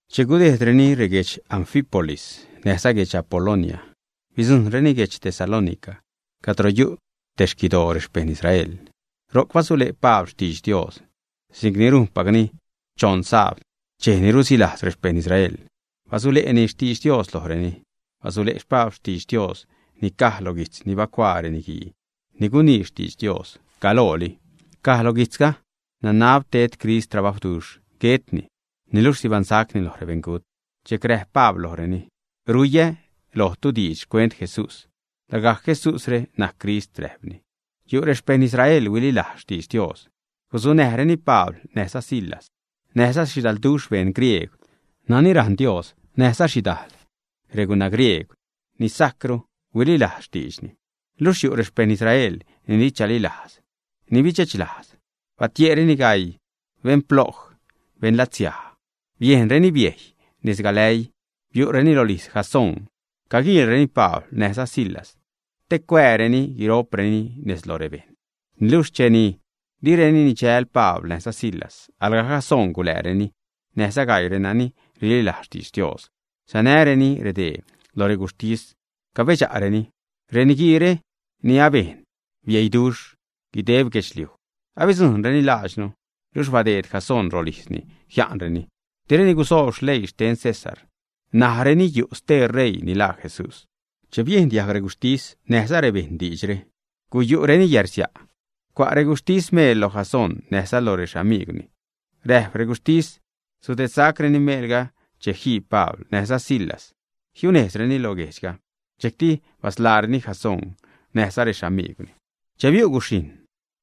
Che gudejdreni reguedx Anfípolis, näjza guedx Apolonia, bidzujṉreni guedx Tesalónica cadro yu' te xquidoo rexpejṉ Israel. Ro'c basule' Pabl xtidx Dios si'c ni rujnpacni. Choṉ sabd, dxej ni rusilajz rexpejṉ Israel, basule'ni xtidx Dios lojreni. Basule' Pabl xtidx Dios ni caj lo guijtz ni bacuaa reniguii ni gunii xtidx Dios galooli. Caj lo guijtzga: “Nanab ted Crist trabajwduxh, guetni, niluxh sibaṉsacni lo rebeṉgut.” Dxejc räjp Pabl lojreni: ―Ruiä lojtu diidx xcuent Jesús; lagajc Jesúsre najc Crist ―räjpni. Yu' rexpejṉ Israel huililajz xtidx Dios, gusanäjreni Pabl näjza Silas. Näjza xhidalduxh beṉ griegw nani rajṉ Dios näjza xhidajl reguna griegw ni sajcru huililajz xtiidxni. Luxh yu' rexpejṉ Israel ni di chalilajz, ni bidxechlajz. Batie'reni gaii beṉploj, beṉlatsiaj, bejnreni biejy nez galäii. Biu'reni rolijz Jasón caguiilreni Pabl näjza Silas te cuääreni guiro'preni nez lo rebejṉ. Niluxh che direni nidxäl Pabl näjza Silas, alga Jasón gulääreni näjza gaii renani rililajz xtidx Dios, sanääreni redee lo reguxhtis, cabedxa'reni: ―Reniguiire ni abejn bieiduxh guideb guedxliuj abidzujṉreni laadxnu, luxh badeed Jasón rolijzni jia'nreni. Direni gusoob leii xten César, najreni yu' stee ṟeii ni laa Jesús. Che biejn diajg reguxhtis näjza rebejṉ diidxre, guyu'reni yärsia'. Cua' reguxhtis meel lo Jasón näjza lo rexamigwni. Räjp reguxhtis sudedsacreni meelga che jii Pabl näjza Silas, jiunejzreni lo guejdxga. Dxejcti basḻaareni Jasón näjza rexamigwni. Che biu' guxhijṉ,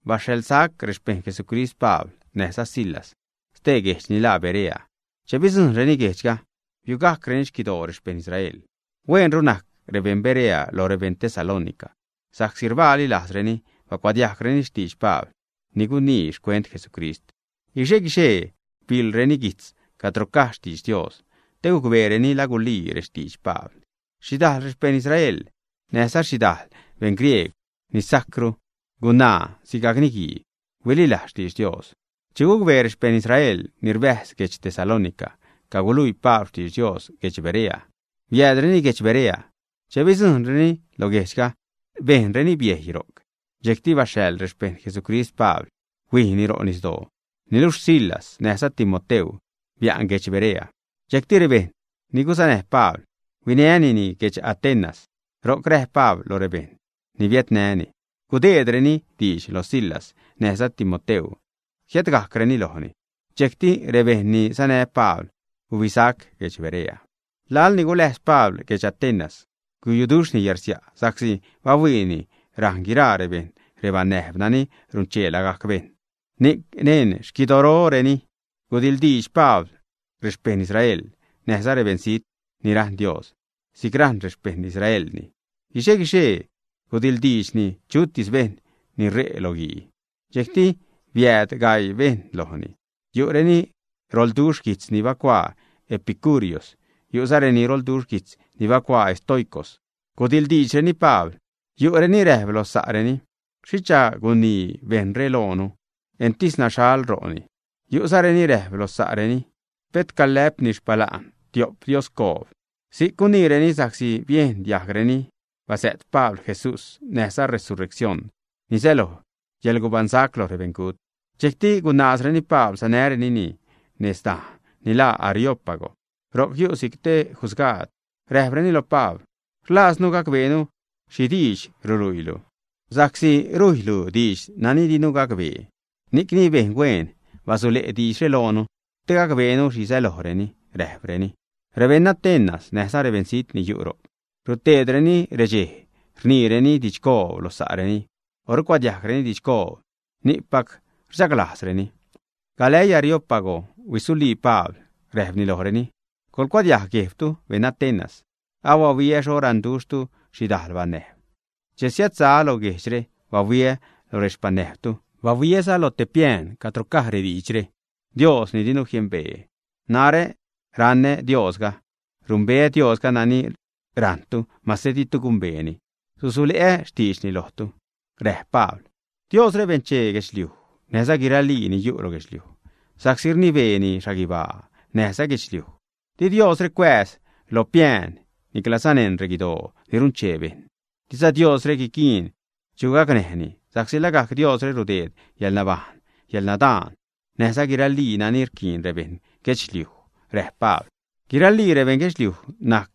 baxhaḻgajc rexpejṉ Jesucrist Pabl näjza Silas ste guejdx ni laa Berea. Che bidzujṉreni guejdxga, biugajcreni xquidoo rexpejṉ Israel. Hueenru najc rebeṉ Berea loj rebeṉ Tesalónica, sa'csi rbaali lajzreni bacuadiajgreni xtidx Pabl ni guniini xcuent Jesucrist. Guixe-guixee biḻreni guijtz cadro caj xtidx Dios te gucbeereni la gulii rextidx Pabl. Xhidajl rexpejṉ Israel näjza xhidajl beṉ griegw ni sajcru, gunaa sigajc niguii, huililajz xtidx Dios. Che gucbee rexpejṉ Israel ni rbäjz guedx Tesalónica caguluii Pabl xtidx Dios guedx Berea, biäädreni guedx Berea. Che bidzujṉreni lo guejdxga bejnreni biejy ro'c. Dxejcti baxhaḻ rexpejṉ Jesucrist Pabl, huijni ro' nisdoo. Niluxh Silas näjza Timoteu bia'n guedx Berea. Dxejcti rebejṉ ni guzanäj Pabl huinänini guedx Atenas. Ro'c räjp Pabl lo rebejṉ ni biädnäni gudeedreni diidx lo Silas näjza Timoteu jiädgajcreni lojni. Dxejcti rebejṉ ni sanä Pabl gubisac guedx Berea. Laḻ ni guläjz Pabl guedx Atenas, guyuduxhni yärsia' sa'csi bahuiini rajṉ guiraa rebejṉ rebanäjb nani runchee lagajc bejṉ. Ni'c neṉ xquidooreni gudiḻdiidx Pabl rexpejṉ Israel näjza rebeṉzijt ni rajṉ Dios si'c rajṉ rexpejṉ Israelni. Guixe-guixee gudiḻdiidxni chutis bejṉ ni ṟe' lo guii. Dxejcti biääd gaii bejṉ lojni. Yu' reni roḻduxh guijtz ni bacuaa epicúreos, yu'za renani roḻduxh guijtz ni bacuaa estoicos, gudiḻdiidxreni Pabl. Yu' reni räjp lo sa'reni: ―¿Xhicha guinii bejṉre loonu? Entis naxhal ro'ni. Yu'zareni räjp lo sa'reni: ―Pet calä'pni xpala'n tiop dioscoob. Si'c guniireni sa'csi biejn diajgreni bazä't Pabl “Jesús” näjza “Resureccion”, ni säloj yäḻgubaṉsac lo rebeṉgut. Dxejcti gunaazreni Pabl sanärenini nez dajn ni laa Areópago. Ro'c yu' si'c te jusgaad. Räjpreni lo Pabl: ―Rlaaznu gacbeenu xhi diidx ruluiilu, sa'csi rujylu diidx nani dinu jiacbee. Ni'cni bejn huen, basule' diidxre loonu te gacbeenu xhi sälojreni ―räjpreni. Rebeṉ Atenas näjza rebeṉzijt ni yu' ro'c ruteedreni redxej rniireni didxcoob lo sa'reni, o rucuadiajgreni didxcoob. Ni'cpac rchaglajzreni. Galäii Areópago huisulii Pabl, räjpni lojreni: ―Coḻcuadiajg guejbtu, beṉ Atenas. Abahuiä xho raṉduxhtu xhidajl banäjb. Che siädsaä́ lo guejdxre, bahuiä lo rexpanäjbtu. Bahuiäza loj te piään cadro caj rediidxre: “Dios ni dinu jiembee.” Narä raṉä Diosga. Rumbeä Diosga nani rajṉtu mase ditu gumbeeni. Susule'ä xtiidxni lojtu. Räjp Pabl: ―Diosre benchee guedxliuj näjza guiralii ni yu' lo guedxliuj, sa'csi rnibeeni xhaguibaa näjza guedxliuj. Di Diosre cuääz lo piään niclaza neṉ reguidoo ni runchee bejṉ. Diza Diosre guiquiin chu gacnäjni sa'csi lagajc Diosre rudeed yäḻnabajṉ, yäḻnadaan, näjza guiralii nani rquiin rebeṉ guedxliuj. Räjp Pabl: ―Guiralii rebeṉ guedxliuj najc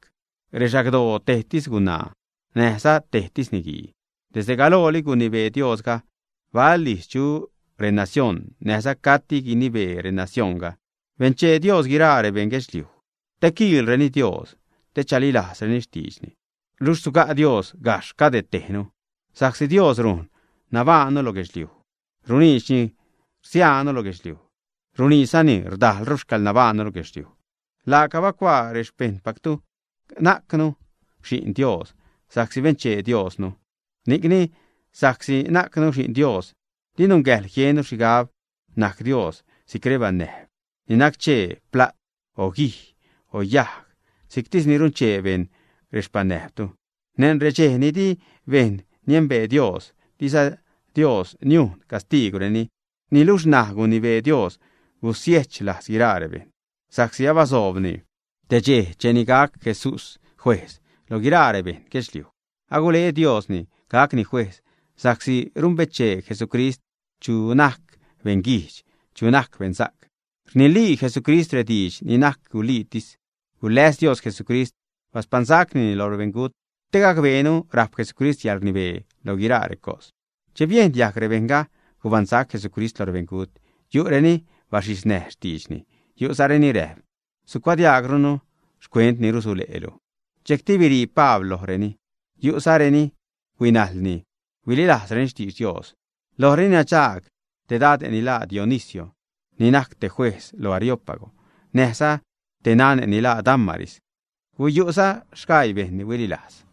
rexagdoo tejsi gunaa näjza tejsi niguii. Desde galooli gunibee Diosga bal ijz chu renacioṉ, näjza cati gunibee renacioṉga. Benchee Dios guiraa rebeṉ guedxliuj te quiilreni Dios te chalilajzreni xtiidxni. Luxh suga' Dios gajxh cadetejnu, sa'csi Dios rujn nabajṉnu lo guedxliuj, runiidxni rsiaanu lo guedxliuj, runiidxzani rdajlru xcäḻnabaṉnu lo guedxliuj. Laaca bacuaa rexpeṉnajntu: “Najcnu xi'n Dios, sa'csi benchee Diosnu.” Ni'cni, sa'csi najcnu xi'n Dios, di nungäjḻ jiennu xhigab najc Dios si'c rebanäjb ni nac-chee pla't, o guij, o yajg si'ctis ni runchee bejṉ rexpanäjbtu. Neṉ redxej ni di bejṉ niembee Dios, diza Dios niujn castiigwreni. Niluxh ṉaj gunibee Dios gusiechlajz guiraa rebejṉ, sa'csi abasoobni te dxej cheni gac Jesús juejz lo guiraa rebeṉ guedxliuj. Agule Diosni gacni juejz, sa'csi rumbechee Jesucrist chu najc beṉguijdx, chuza najc beṉsa'c. Rnilii Jesucrist rediidx ni najc guliitis. Guläs Dios Jesucrist, baspaṉsacnini lo rebeṉgut, te gacbeenu rajp Jesucrist yäḻrnibee lo guiraa recos. Che biejn diajg rebejṉga gubaṉsac Jesucrist lo rebeṉgut yu' reni baxhiznäj xtiidxni. Yu'za reni räjp: ―Sucuadiajgrunu xcuent ni rusule'lu. Dxejcti birii Pabl lojreni. Yu'za reni huinajlni, huililajzreni xtidx Dios. Lojreni nadxaag te dade' ni laa Dionisio ni najc te juejz lo Areópago; näjza te nane' ni laa Dámaris. Guyu'za sgaii bejṉ ni huililajz.